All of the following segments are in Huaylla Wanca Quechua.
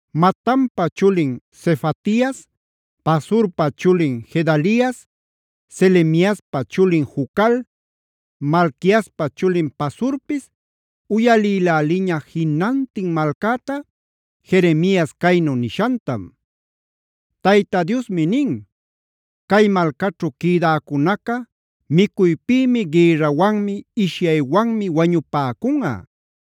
Matanpa chulin Sefatias, Pasurpa chulin Gedalias, Selemiaspa chulin Jucal, Malquiaspa chulin Pasurpis uyalïläliña jinantin malcäta Jeremias caynu nishantam: “Tayta Diosmi nin: ‘Cay malcaćhu quïdäcunaca micuypïmi, gïrrawanmi, ishyaywanmi wañupäcunꞌa.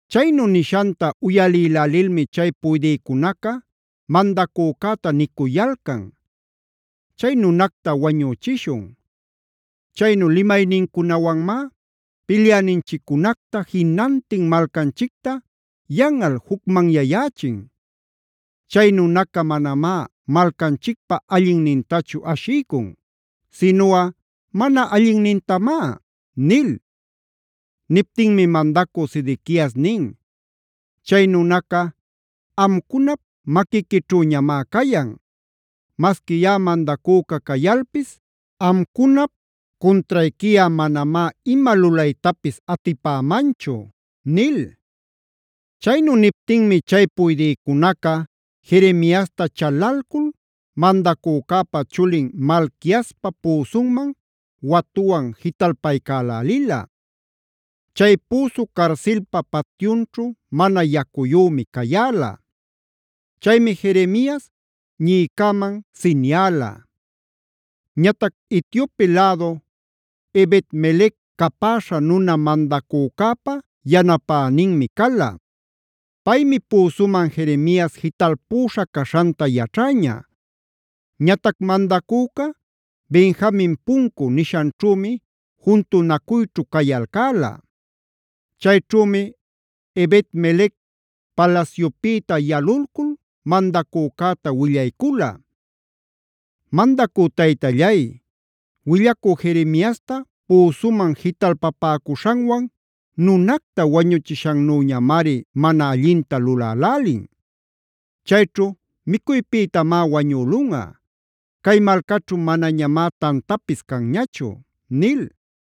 Chaynu nishanta uyalïlälilmi chay puydïcunaca mandacücäta nicuyalcan: “Chay nunacta wañüchishun. Chaynu limaynincunawanmá pilyäninchiccunacta, jinantin malcanchicta yanꞌal jucmanyayächin. Chay nunaca manamá malcanchicpä allinnintachu ashiycun, sinuꞌa mana allinnintamá” nil. Niptinmi mandacü Sedequias nin: “Chay nunaca, amcunap maquiquićhüñamá cayan. Masqui yaꞌa mandacüca cayalpis amcunap cuntrayquiꞌa manamá ima lulaytapis atipämanchu” nil. Chaynu niptinmi chay puydïcunaca Jeremiasta chalalcul mandacücäpa chulin Malquiaspa püsunman watuwan jitalpaycälälila. Chay püsu carsilpa patyunćhu mana yacuyümi cayäla. Chaymi Jeremias ñiꞌicäman siniala. Ñatac Etiope lädu Ebed-melec capäśha nuna mandacücäpa yanapäninmi cala. Paymi püsuman Jeremias jitalpüśha caśhanta yaćhäña. Ñatac mandacüca Benjamin Puncu nishanćhümi juntunacuyćhu cayalcäla. Chayćhümi Ebed-melec palasyupïta yalulcul mandacücäta willaycula: “Mandacü taytallay, willacü Jeremiasta püsuman jitalpapäcuśhanwan nunacta wañuchishannüñamari mana allinta lulälälin. Chayćhu micuypïtamá wañülunꞌa; cay malcaćhu manañamá tantapis canñachu” nil.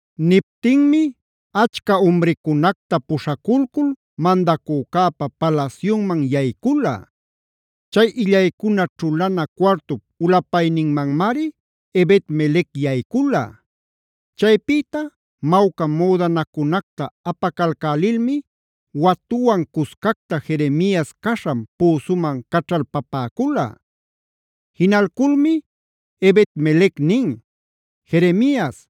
Niptinmi achca umricunacta puśhaculcul mandacücäpa palasyunman yaycula. Chay illaycuna ćhulana cuartup ulapayninmanmari Ebed-melec yaycula. Chaypïta mawca müdanacunacta apacalcälilmi watuwan cuscacta Jeremias caśhan püsuman caćhalpapäcula. Jinalculmi Ebed-melec nin: “Jeremias,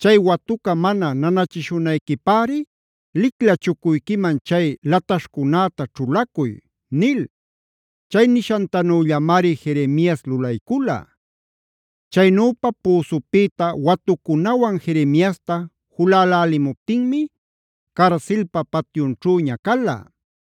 chay watuca mana nanachishunayquipäri licla chucuyquiman chay lataśhcunäta ćhulacuy” nil. Chay nishantanüllamari Jeremias lulaycula. Chaynüpa püsupïta watucunawan Jeremiasta julälälimuptinmi carsilpa patyunćhüña cala.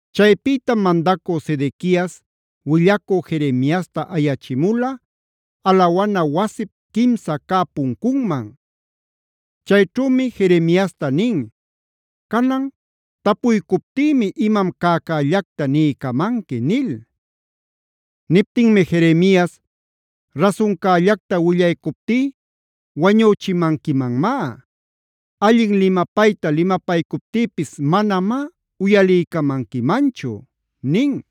Chaypïtam mandacü Sedequias willacü Jeremiasta ayachimula alawana wasip quimsa cä puncunman. Chayćhümi Jeremiasta nin: “Canan tapuycuptïmi imam cäcällacta niycamanqui” nil. Niptinmi Jeremias: “Rasuncällacta willaycuptí wañüchimanquimanmá. Allin limapayta limapaycuptïpis manamá uyaliycamanquimanchu” nin.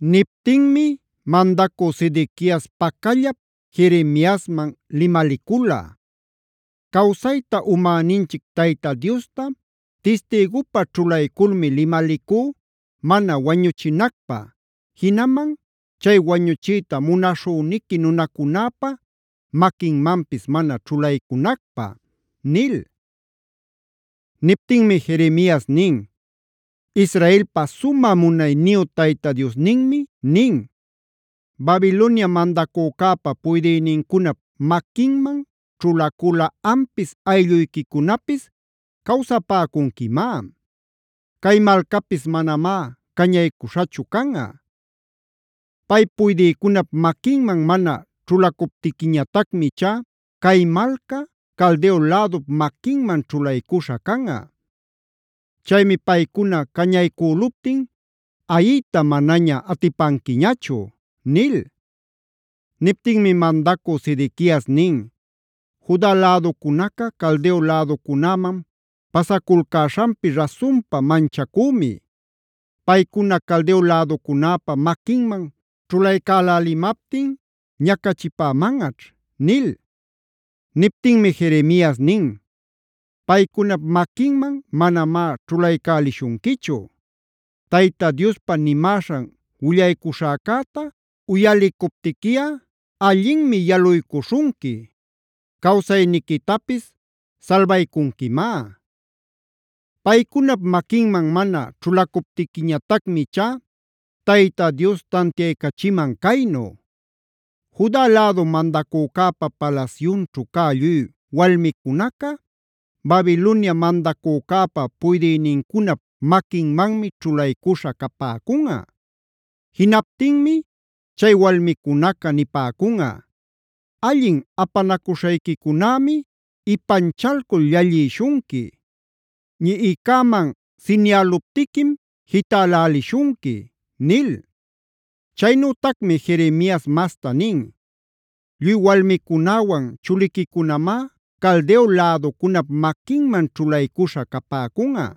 Niptinmi mandacü Sedequias pacallap Jeremiasman limalicula: “Cawsayta umäninchic Tayta Diosta tistïgupä ćhulayculmi limalicú mana wañuchinacpä, jinaman chay wañuchiyta munaśhüniqui nunacunäpa maquinmanpis mana ćhulaycunacpä” nil. Niptinmi Jeremias nin: “Israelpa sumä munayniyu Tayta Diosninmi nin: ‘Babilonia mandacücäpa puydïnincunap maquinman ćhulaculꞌa ampis aylluyquicunapis cawsapäcunquimá. Cay malcapis manamá cañaycuśhachu canꞌa. Pay puydïcunap maquinman mana ćhulacuptiquiñatacmi ichá cay malca Caldeo lädup maquinman ćhulaycuśha canꞌa. Chaymi paycuna cañaycüluptin ayiyta manaña atipanquiñachu’” nil. Niptinmi mandacü Sedequias nin: “Juda läducunaca Caldeo läducunäman pasaculcäśhanpi rasunpa manchacümi. Paycuna Caldeo läducunäpa maquinman ćhulaycälälimaptin ñacachipämanꞌaćh” nil. Niptinmi Jeremias nin: “Paycunap maquinman manamá ćhulaycälishunquichu. Tayta Diospa nimäśhan willaycuśhäcäta uyalicuptiquiꞌa allinmi yaluycuśhunqui; cawsayniquitapis salbaycunquimá. Paycunap maquinman mana ćhulacuptiquiñatacmi ichá Tayta Dios tantiaycachiman caynu: Juda lädu mandacücäpa palasyunćhu cä lluy walmicunaca Babilonia mandacücäpa puydïnincunap maquinmanmi ćhulaycüśha capäcunꞌa. Jinaptinmi chay walmicunaca nipäcunꞌa: “ ‘Allin apanacuśhayquicunämi ipanchalcul llallïshunqui. Ñiꞌicäman sinialuptiquim jitälälishunqui’” nil. Chaynütacmi Jeremias masta nin: “Lluy walmicunäwan chuliquicunamá Caldeo läducunap maquinman ćhulaycuśha capäcunꞌa.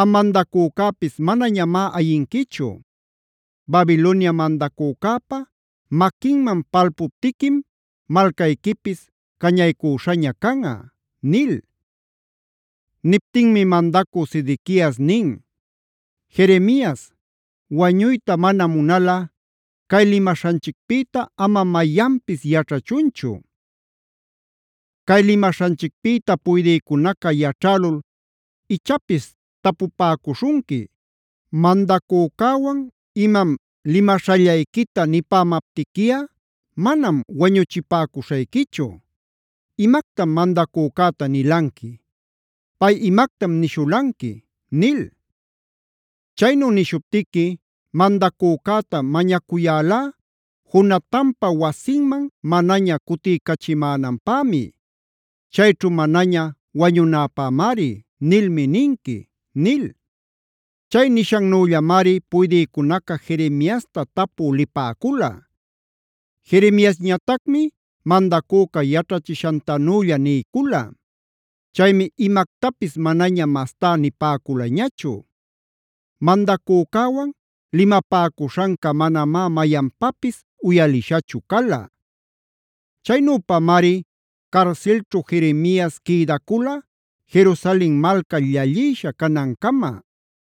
Am mandacücäpis manañamá ayinquichu; Babilonia mandacücäpa maquinman palpuptiquim malcayquipis cañaycüśhaña canꞌa” nil. Niptinmi mandacü Sedequias nin: “Jeremias, wañuyta mana munalꞌa cay limaśhanchicpïta ama mayanpis yaćhachunchu. Cay limaśhanchicpïta puydïcunaca yaćhälul ichapis tapupäcuśhunqui: ‘Mandacücäwan imam limaśhallayquita nipämaptiquiꞌa manam wañuchipäcuśhayquichu. ¿Imactam mandacücäta nilanqui? ¿Pay imactam nishulanqui?’ nil. Chaynu nishuptiqui: ‘Mandacücäta mañacuyälá Jonatanpa wasinman manaña cutiycachimänanpämi; chayćhu manaña wañunäpämari’ nilmi ninqui” nil. Chay nishannüllamari puydïcunaca Jeremiasta tapü lipäcula. Jeremiasñatacmi mandacüca yaćhachishantanülla niycula. Chaymi imactapis manaña mastá nipäculañachu. Mandacücäwan limapäcuśhanca manamá mayanpapis uyalishachu cala. Chaynüpamari carsilćhu Jeremias quïdacula Jerusalen malca llallïsha canancama.b